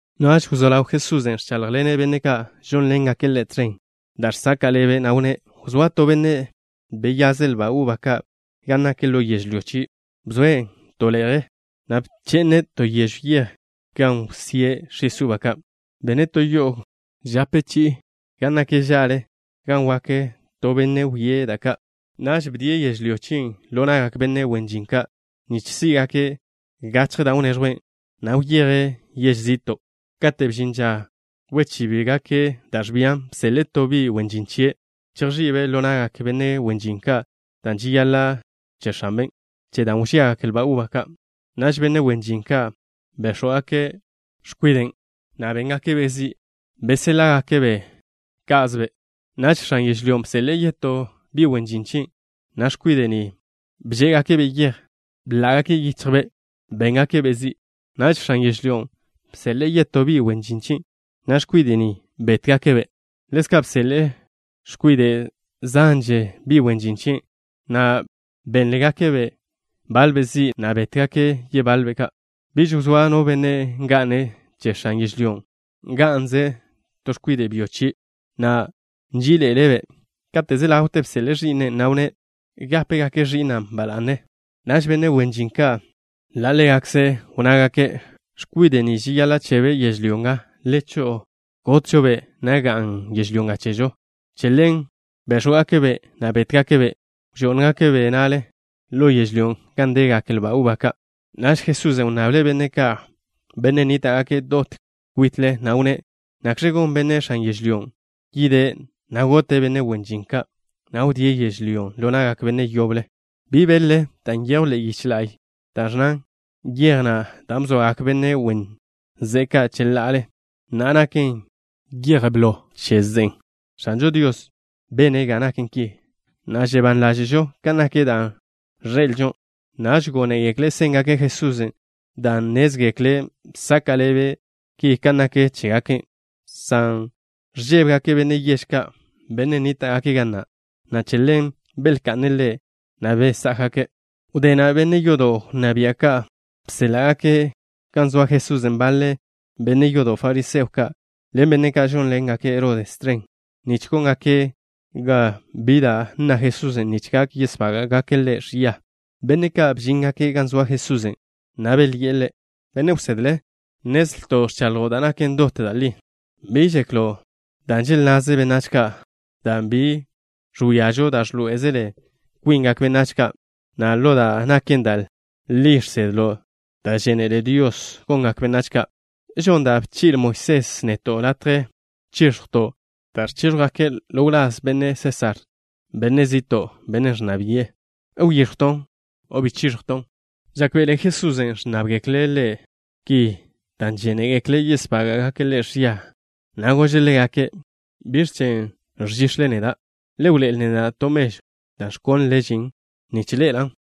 Naž wzó ḻaw Jesusen' ẕcháḻjḻene' benne' ka' žónḻengake' Ḻe' tẕen da' žsaka' ḻebe', na' wnné': —Wzóa to benne' beyaze' lba uba ka' gan nak ḻo yežlyó chie'. Bzoe' to le'je chen, na' bche'ne' to yežw yej gan wsíe' x̱is uba ka'. Bene' to yo'o gope gan nak ža'le gan wak to benne' wie' da' ka'. ’Naž bdie' yežlyó chien' ḻo na'gak benne' wen žin ka', nich sí'gake' gachje da' wneẕjwen, na' wyeje' yež zi'to'. Kate' bžin ža wchíbgake' da' ẕbian, bseḻe'e to bi' wen žin chie' chejx̱i'be' ḻo na'gak benne' wen žin ka' dan' žeyaḻa' che x̱anbe' che da' wbíagak lba uba ka'. Naž benne' wen žin ka' béx̱wgake' x̱kwiden', na' béngake'-be' zi'. Beséḻa'gake'-be' ká'zebe'. Naž x̱an yežlyón' bseḻe'e yetó bi' wen žin chie', na' x̱kwide' ni bžé'egake'-be' yej, na' bḻá'gake' yichjbe'. Béngake'-be' zi'. Naž x̱an yežlyón' bseḻe'e yetó bi' wen žin chie', na' x̱kwide' ni bétgake'-be'. Ḻezka' bseḻe'e x̱kwide' zanže bi' wen žin chie' ka', na' bénḻe'egake' baḻbe' zi', na' bétgake' yebaḻbe'. ’Biž wzóa no benne' nga'ne' che x̱an yežlyón'. Nga'nze to x̱kwide' byo chie', na' nží'iḻe'ele'-be'. Kate' wzé ḻawte bseḻe'e ẕi'ne', na' wnné': “Gápegake' ẕi'na' ba la'ne.” Naž benne' wen žin ka', ḻa' ḻégakze' wnnágake': “X̱kwide' ni žeyaḻa' chebe' yežlyó nga. Le cho'o, gotžo-be', na' ga'n yežlyó nga chežo.” Che ḻen béx̱wgake'-be', na' bétgake'-be'. Bžó'ngake'-be' na'le ḻo yežlyón' gan degak lba uba ka'. Naž Jesusen' wnnable' benne' ka', benne' nníta'gake' dot kwite', na' wnné': —¿Nakx̱ gon benne' x̱an yežlyón'? Yide', na' gote' benne' wen žin ka', na' wdíe' yežlyón' ḻo na'gak benne' yoble. ’¿Bi beḻ-le da' nyejw ḻe'e yiche la'y? Ki ẕnnan: Yej na' da' bzoagak benne' wen ze'e ka' cheḻa'ale, na'a naken yej ḻen blo che ze'e. X̱anžo Dios bene' ga naken ki, na' žebán ḻáže'žo kan nak da' ẕḻe'elžo. Naž gónegekle' séngake' Jesusen' dan' nnézgekle' bsaka' ḻebe' ki kan nak chégake', san ẕžébegake' benne' yež ka', benne' nníta'gake' ga na', na' che ḻen belka'ne' Ḻe', na' beyéjgake'. Wdé na' benne' yodo' wnná bia' ka' bséḻa'gake' gan zoa Jesusen' baḻe benne' yodo' fariseo ka' ḻen benne' ka' žónḻengake' Herodes tẕen, nich góngake' ga bi da' nna Jesusen' nich gak yesbága'gake' Ḻe' ẕia. Benne' ka' bžíngake' gan zoa Jesusen', na' belyi'e Ḻe': —Benne' wsedle, nnezlto' ẕchaḻjo' da' naken dot da' li. Bi žeklo' da' želnnaze benách ka', dan' bi ẕwíazo' da' ẕḻoé'ezele kwingak benách ka', na' ḻo da' naken da' li žsedlo' da' žénele Dios gongak benách ka'. ¿Žonn da' bchi'le Moisés neto' latje chiẕjw lazto' da' ẕchíẕjwgake' ḻo wláz Benne' Sésar, benne' zi'to', bennen' ẕnná bi'e? ¿Wyíẕjwton' o bi chíẕjwton'? Žákbe'ele Jesusen' ẕnnábgekle' Ḻe' ki dan' žénegekle' yesbága'gake' Ḻe' ẕia, na' gože' ḻégake': —¿Biẕ chen' ẕžix̱le neda'? Le wḻoé'el neda' to mežw da' ẕkónlele žin nich ḻe'elan'.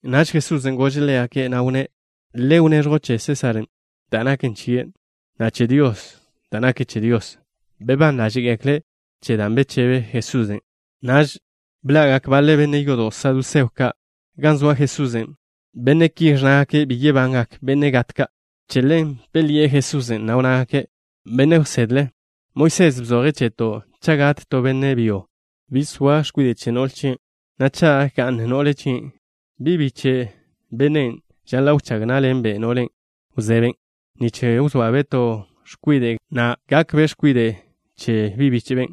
Naž Jesusen' gože' ḻégake', na' wnné': —Le wneẕjw che benne' Sésar da' naken che benne' Sésar, na' che Dios da' naken che Dios. Bebán ḻáže'gekle' che dan' bechebe Jesusen'. Naž bḻa'gak baḻe benne' yodo' saduseo ka' gan zoa Jesusen'. Benne' ki ẕnnágake' bi yebangak benne' gat ka'. Che ḻen belyi'e Jesusen', na' wnnágake': —Benne' wsedle, Moisés bzoje' cheto' cha' gat to benne' byo, bi zoa x̱kwide' chie', na' cha' ga'n no'le chie', bi' biche' bennen' žaḻa' wchág ná'ḻenbe' no'le wzeben', nich wzoabe' to x̱kwide' gakbe' x̱kwide' che bíche'ben'.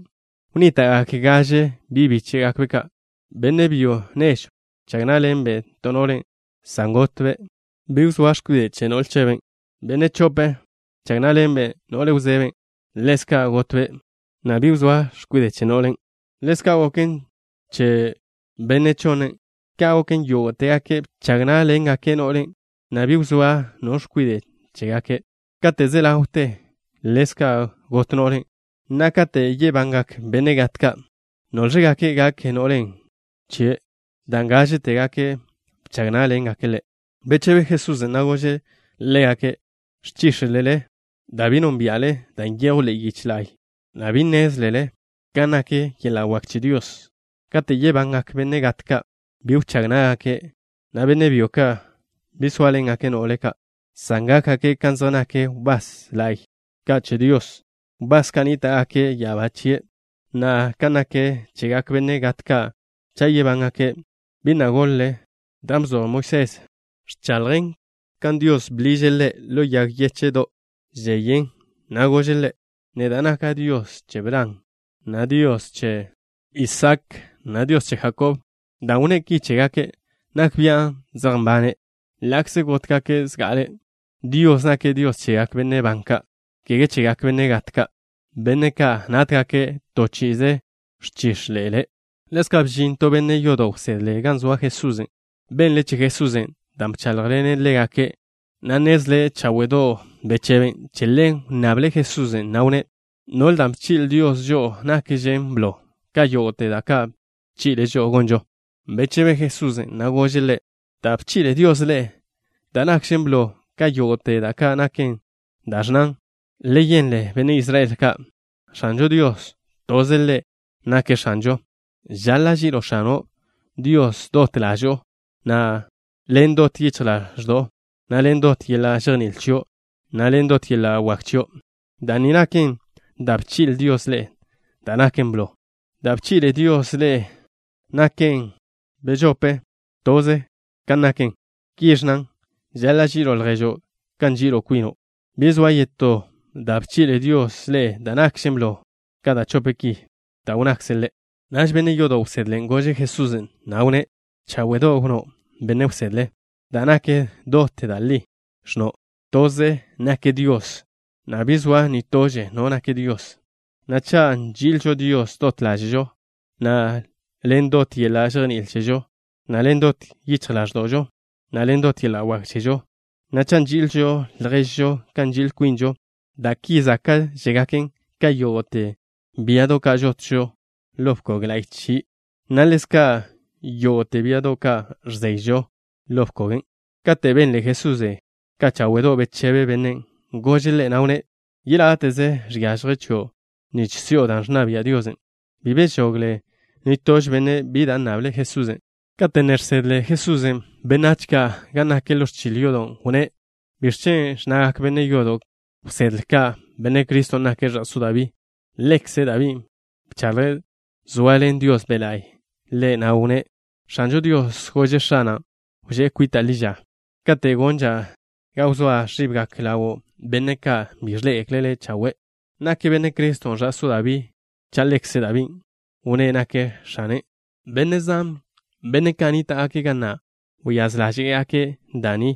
Wnníta'gak gaže bi' bíche'gakbe'. X̱kwide' byo nežw bchag ná'ḻenbe' to no'le, san gotbe', bi wzóa x̱kwide' chebe'. X̱kwide' byo bežope bchag ná'ḻenbe' no'le wzeben', san ḻezka' gotbe', bi wzóa x̱kwide' chebe'. Ḻezka' goken che x̱kwide' byo beyonne. Ka' goken, yógo'tebe' bchag ná'ḻenbe' no'len', na' bi wzóa no x̱kwide' chégakbe'. Kate' ze ḻawte, ḻezka' got no'len'. Na'a, kate' yebangak benne' gat ka', ¿Nóẕlgakbe' gak no'len' chebe', dan' gážetebe' bchag ná'ḻengakbe' ḻe'? Bechebe Jesusen', na' gože' ḻégake': —Ẕchíx̱lele dan' bi nónbia'le da' nyejw ḻe'e yiche la'y, na' bi nnézlele kan nak yeḻa' wak che Dios. Kate' yebangak benne' gat ka', bi wchág ná'gake', na' benne' byo ka' bi sóaḻengake' no'le ka', san gákgake' kan zej nak wbás la'y ka' che Dios, wbás ka' nníta'gake' ya'abá chie'. Na'a, kan nak chegak benne' gat ka' cha' yebángake', ¿bi na' goḻ-le dan' bzoj Moisés? Ẕchaḻjen kan Dios bḻiže' ḻe' ḻo yag yéche'do' da' žeyen, na' gože' ḻe': “Neda' naka' Dios che Bran, na' Dios che Isaak, na' Dios che Jakob.” Dan' wnné' ki chégake', nak bia' zej nbane' ḻa'kze gótgake' zga'ale. Dios nake' Dios chegak benne' ban ka', kege chegak benne' gat ka', benne' ka' nátgake' to chi'ize. Ẕchíxḻe'elele. Ḻezka' bžin to benne' yodo' wsedle gan zoa Jesusen'. Benle' che Jesusen' dan' bcháḻjḻene' ḻégake', na' nnezle' cháwe'do' bechebe'. Che ḻen wnnable' Jesusen', na' wnné': —¿Biẕ da' bchi'le Dios žo'o nakžen blo ka yógo'te da' ka' bchi'le' žo'o gonžo? Bechebe Jesusen', na' gože' ḻe': —Da' bchi'le Dios ḻe'e da' nakžen blo ka yógo'te naken da' ẕnnan: Le yenle, benne' Israel ka'. X̱anžo Dios, toze' Ḻe' nake' X̱anžo. Žaḻa' ži'ilo' X̱ano' Dios dot ḻažo'o, na' ḻen dot yichj ḻaẕdo'o, na' ḻen dot yeḻa' žejní'il chio', na' ḻen dot yeḻa' wak chio'. Da' ni naken da' bchi'le Dios ḻe'e da' naken blo. Da' bchi'le Dios ḻe'e da' naken bežope, toze kan naken. Ki ẕnnan: Žaḻa' ži'ilo' lježo' kan nži'il kwino'. Bi zoa yetó da' bchi'le Dios ḻe'e da' nakžen blo ka da' chope ki da' wnnakze' Ḻe'. Naž benne' yodo' wsedlen' gože' Jesusen', na' wnné': —Cháwe'do' wnnó', benne' wsedle. Da' nak dot da' li ẕnno'. Toze nak Dios, na' bi zoa nitože no nak Dios. Na' cha' nži'ilžo Dios dot ḻáže'žo, na' ḻen dot yeḻa' žejní'il chežo, na' ḻen dot yichj ḻáẕdo'žo, na' ḻen dot yeḻa' wak chežo, na' cha' nži'ilžo lježžo kan nži'il kwinžo, da' ki záka'žegaken ka yógo'te biado' ka' žotžo-ba' ḻo bkog la'y che Dios, na' ḻezka' ka yógo'te biado' ka' ẕzeyžo-ba' ḻo bkogen'. Kate' benle Jesusen' ka cháwe'do' bechebe bennen', gože' ḻe', na' wnné': —Yeláte'ze žiažje chio' nich si'o da' ẕnna bia' Dios. Bi bežogle nitože benne' bi da' nnable' Jesusen'. Kate' ne žsedle Jesusen' benách ka' gan nak ḻo ẕchil yodo', wnné': —¿Biẕ chen' ẕnnagak benne' yodo' wsedle ka' Benne' Criston' nake' ẕa'só Dabí? Ḻekze Dabín' bchaḻje', zoaḻen Dios Be' La'y ḻe', na' wnné': X̱anžo Dios gože' X̱ana': “Wžé' kwita' ḻi ža kate' gonža' ga wzóa ẕibgak ḻawo' benne' ka' bi ẕḻé'egekle' Le' chawe'.” ¿Nak Benne' Criston' ẕa'só Dabí cha' ḻekze Dabín' wnné' nake' X̱ane'? Benne' zan, benne' ka' nníta'gake' ga na' wyáz ḻáže'gake' da' ni,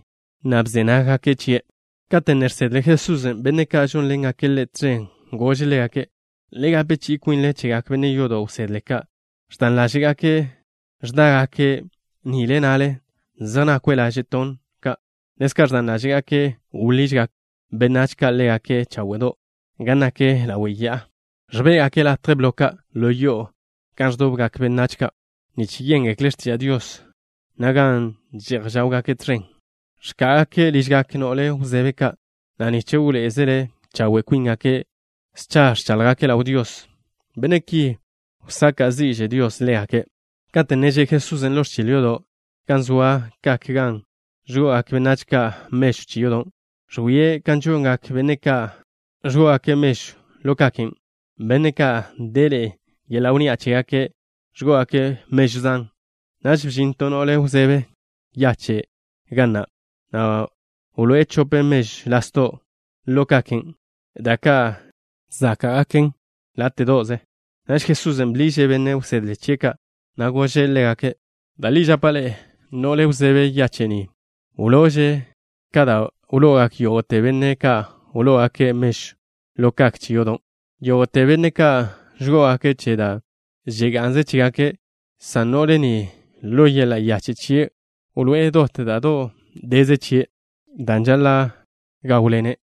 na' bze nággake' chie'. Kate' ne žsedle Jesusen' benne' ka' žónḻengake' Ḻe' tẕen, gože' ḻégake': —Le gape chi'i kwinle chegak benne' yodo' wsedle ka'. Ẕdan ḻáže'gake' ẕdágake' nile na'le, zej nakwe' laže' tonn ka'. Ḻezka' ẕdan ḻáže'gake' wḻižgak benách ka' ḻégake' cháwe'do' gan nak ḻawe' ya'a. Ẕbé'gake' latje blo ka' ḻo yo'o gan ẕdobgak benách ka' nich yéngekle' x̱tiža' Dios, na' gan že'j žawgake' tẕen. Ẕká'agake' ližgak no'le wzebe ka', na' nich wḻoé'ezele chawe' kwíngake', scha ẕcháḻjgake' ḻaw Dios. Benne' ki, wsaka' zi'že Dios ḻégake'. Kate' ne že' Jesusen' ḻo ẕchil yodo' gan zoa kak gan ẕgo'ogak benách ka' mežw che yodo', ẕwie' kan žongak benne' ka' ẕgó'ogake' mežw ḻo kaken'. Benne' ka' deḻe'e yeḻa' wnni'a chégake' ẕgó'ogake' mežw zan. Naž bžin to no'le wzebe yache' ga na', na' wloé'e chope mežw lasdo' ḻo kaken', da' ka' záka'gaken láte'do'ze. Naž Jesusen' bḻiže' benne' wsedle chie' ka', na' gože' ḻégake': —Da' li žapa' ḻe'e, no'le wzebe yache' ni wlo'ože' ka dan' wlo'ogak yógo'te benne' ka' wló'ogake' mežw ḻo kak che yodo'. Yógo'te benne' ka' ẕgó'ogake' che da' nga'nze chégake', san no'le ni, ḻo yeḻa' yache' chie' wloé'e dot da' do' deze chie', dan' žaḻa' gáwḻene'.